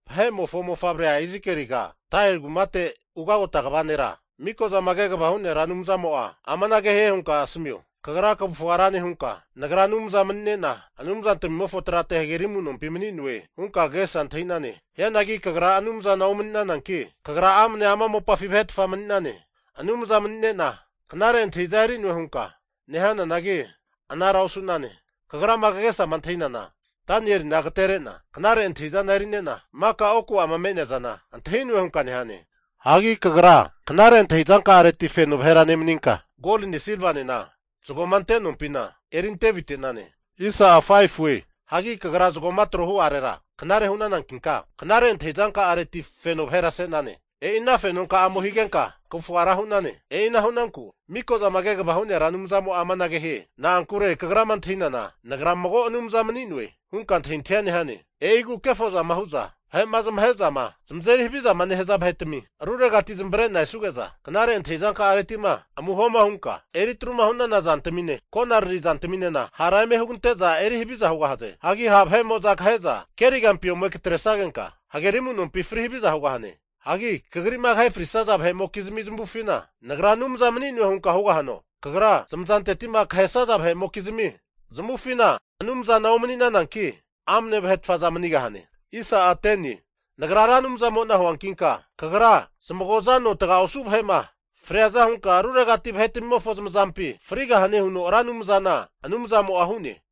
Vahe'mofo mofavre Izikieliga, Tairi kumate ugagota kva nera Mikozama Kegavama Hu'nea Ra Anumzamo'a amanage hie hunka asamio, kagra kavufga ra nehunka nagra anumza mani'nena anumzantmimofo trate hageri amu'nompi mani'noe hunka kagesa antahi'nane. Hianagi kagra anumzana omani'nananki, kagra amne ama mopafi vahetfa mani'nane. Anumza mani'nena knare antahiza eri'noe hunka nehananagi anara osu'nane. Kagrama kagesama antahi'nana, Danielina agaterena knare antahi'zana eri'nena, maka oku'ama me'nea zana antahi'noe hunka nehane. Hagi kagra knare antahi'zanka'areti feno vahera nemaninka, goline silvanena zagoma ante nompina eri ante avite'nane. Hagi kagra zagoma trohu'arera knare hu'nanankinka, knare antahi zanka'areti feno vahera se'nane. E'i ana fenonka'amo higenka kavufa ra hu'nane. E'ina hu'nanku Mikozama Kegavama Hu'nea Anumzamo'a amanage hie, na'ankure kagrama antahinana, nagra mago anumza mani'noe hunka antahintahia nehane. E'igu kefozama hu'za vahe'ma zamahe'zama zamazeri havizama nehaza vahetami ruregati zamavare'na esuge'za, knare antahi'zanka'aretima amuhoma hunka eri atru'ma hu'nana zantamine, konarari zantaminena hara eme hugante'za eri haviza hugahaze. Hagi ha' vahe'mo'za kahe'za kerigampi ome katresagenka, hageri amu'nompi fri haviza hugahane. Hagi kagri'ma kahe frisaza vahe'mokizmi zamavufina nagra anumza mani'noe hunka hugahano? Kagra zamazanteti'ma kahesaza vahe'mokizmi zamavufina anumzana omanigahananki amne vahe manigahane. Nagra Ra Anumzamo'na huankinka, kagra zamagoza no taga osu vahe'ma friaza hunka ruregati vahetamimofo zamazampi frigahane huno Ra Anumzana Anumzamo'a hu'ne.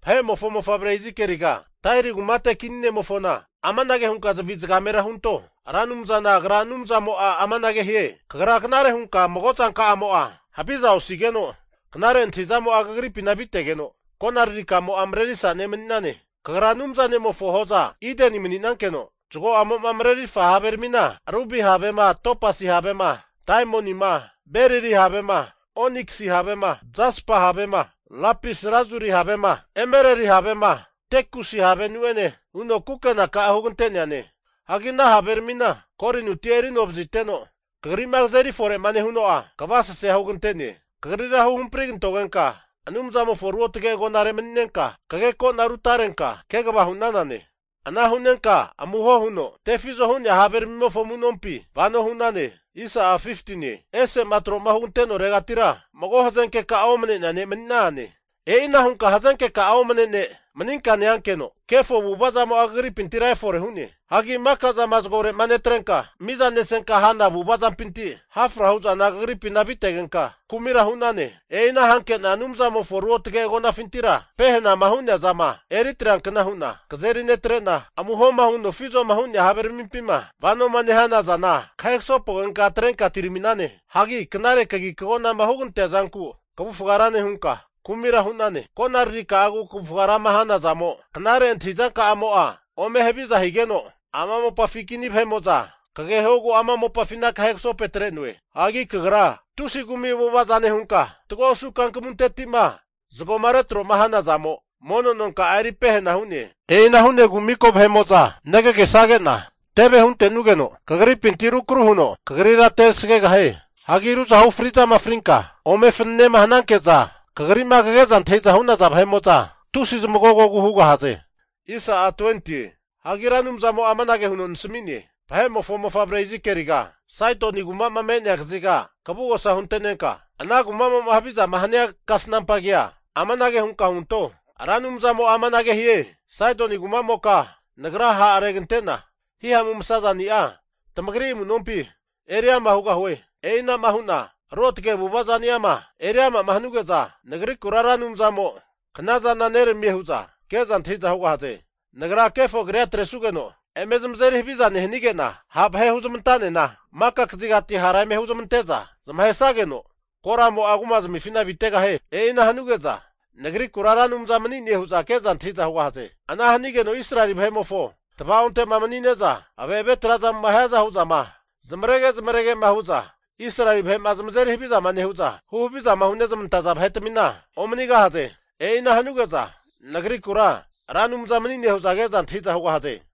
Vahe'mofo mofavre Izikeliga, Tairi kumate kini ne'mofona amanage hunka zavi zagamera hunto. Ra Anumzana Agra Anumzamo'a amanage hie, kagra knare hunka mago zanka'amo'a haviza osigeno knare antahizamo'a kagripina avitegeno, konararika'amo'a marerifa' ne' mani'nane. Kagra Anumza ne'mofo hozafi Ideni mani'nankeno, zago'amo'ma marerirfa haveramina rubi havema, topasi havema, Daimonima, berili havema, oniksi havema, jaspa havema, lapis lazuri havema, emereli havema, tekusi havenu'ene huno kukena hugante'neane. Hagi ana haveramina golinuti eri anovaziteno kagri'ma kazeri fore'ma nehuno'a kavasesea hugante'ne. Kagrira huhampri kantogenka Anumzamofo ruotge agonare mani'nenka, kageko'na rutarenka kegava hu'nanane. Ana hu'nenka amuho huno tefizo hu'nea haveramimofo amu'nompi vano hu'nane. Ese'ma tro'ma hugante'noregatira mago hazenkeka'a omne ne' mani'nane. E'ina hunka hazenkeka'a omane ne' maninka neankeno, kefo avu'ava zamo'a kagripintira efore hu'ne. Hagi mika zama zagore'ma netrenka mizanesenka hana avu'ava zampinti hafra hu'zana kagripina avitegenka, kumira hu'nane. E'ina hanke'na Anumzamofo ruotge agonafintira pehenama hu'nea zama eri atreankna hu'na kazeri netrena, amuho huno tefizoma hu'nea haveramimpima vanoma nehana zana, kahe kasopogenka atrenka atirami'nane. Hagi knare kagi kagonama hugantea zanku kavufaga ra nehunka, kumira hu'nane. Konararika'agu kavufaga rama hanazamo knare antahizanka'amo'a ome haviza higeno, ama mopafi kini vahe'mo'za kagehogu ama mopafina kahe kasopegatre'noe. Hagi kagra tusi kumi avu'avaza nehunka, fatgo osu kankamunteti'ma zagoma retro'ma hana zamo mono nonka'a eri pehena hu'ne. E'ina hu'negu maka vahe'mo'za negagesage'na teve huntenogeno kagripinti rukru huno kagrira tegasagegahie. Hagi ruzahu fri'zama frinka ome fananema hanankeza kagri'ma kage'za antahi'zama hu'naza vahe'mo'za tusi zamagogogu hugahaze. Hagi Ra Anumzamo'a amanage huno nasami'ne, Vahe'mofo mofavre Izikieliga, Saidoni kuma'ma me'nea kaziga kavugosa hunte'nenka, ana kumamo'ma havizama hania kasnampa kea, amanage hunka hunto, Ra Anumzamo'a amanage hie, Saidoni kumamoka Nagra ha'regante'na hihamu masazani'a tamagri amu'nompi eriama hugahue. E'inama hu'na ruotage avu'ava zani'ama eri ama'ma hanuge'za, Nagrikura Ra Anumzamo kanazana neramie hu'za ke'za antahi'za hugahaze. Nagra kefo kria atresugeno eme zamazeri haviza nehanige'na, ha vahe huzmantanena maka kazigati hara eme huzmante'za zamahesageno, koramo'a kumazmifina avitegahie. E'ina hanuge'za Nagrikura Ra Anumza mani'ne hu'za ke'za antahi'za hugahaze. Ana hanigeno Israeli vahe'mofo tava'onte'ma mani'ne'za ave've trazamo'ma hiaza hu'zama zamarege zamaregema hu'za Israeli vahe'ma zamazeri haviza nehu'za, huhavizama hunezmantaza vahetamina omanigahaze. E'ina hanuge'za Nagrikura Ra Anumza mani'ne hu'za keza antahi'za hugahaze.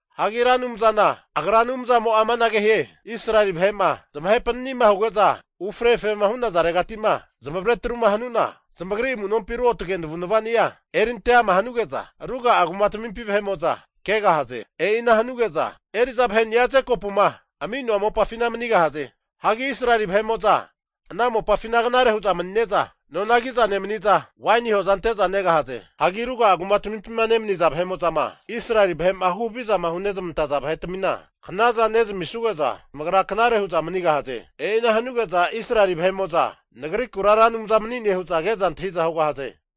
Hagi Ra Anumzana Agra Anumzamo'a amanage hie, Israeli vahe'ma zamahe panani'ma huge'za ufre efrema hu'nazaregati'ma zamavare atruma hanu'na, zamagri amu'nompi ruotge navu'navani'a erinte ama hanuge'za ruga'a kumatamimpi vahe'mo'za kegahaze. E'ina hanuge'za eri'za vaheni'a Jekopuma ami'noa mopafina manigahaze. Hagi Israeli vahe'mo'za ana mopafina knare hu'za manine'za, nona kiza nemaniza waini hoza ante'za negahaze. Hagi ruga'a kumatmimpima nemaniza vahe'mo'zama Israeli vahe'ma hu havizama hunezmantaza vahetmina knaza nezamisuge'za, zamagra knare hu'za manigahaze. E'ina hanuge'za Israeli vahe'mo'za Nagrikura Ra Anumza mani'ne hu'za ke'za antahi'za hugahaze.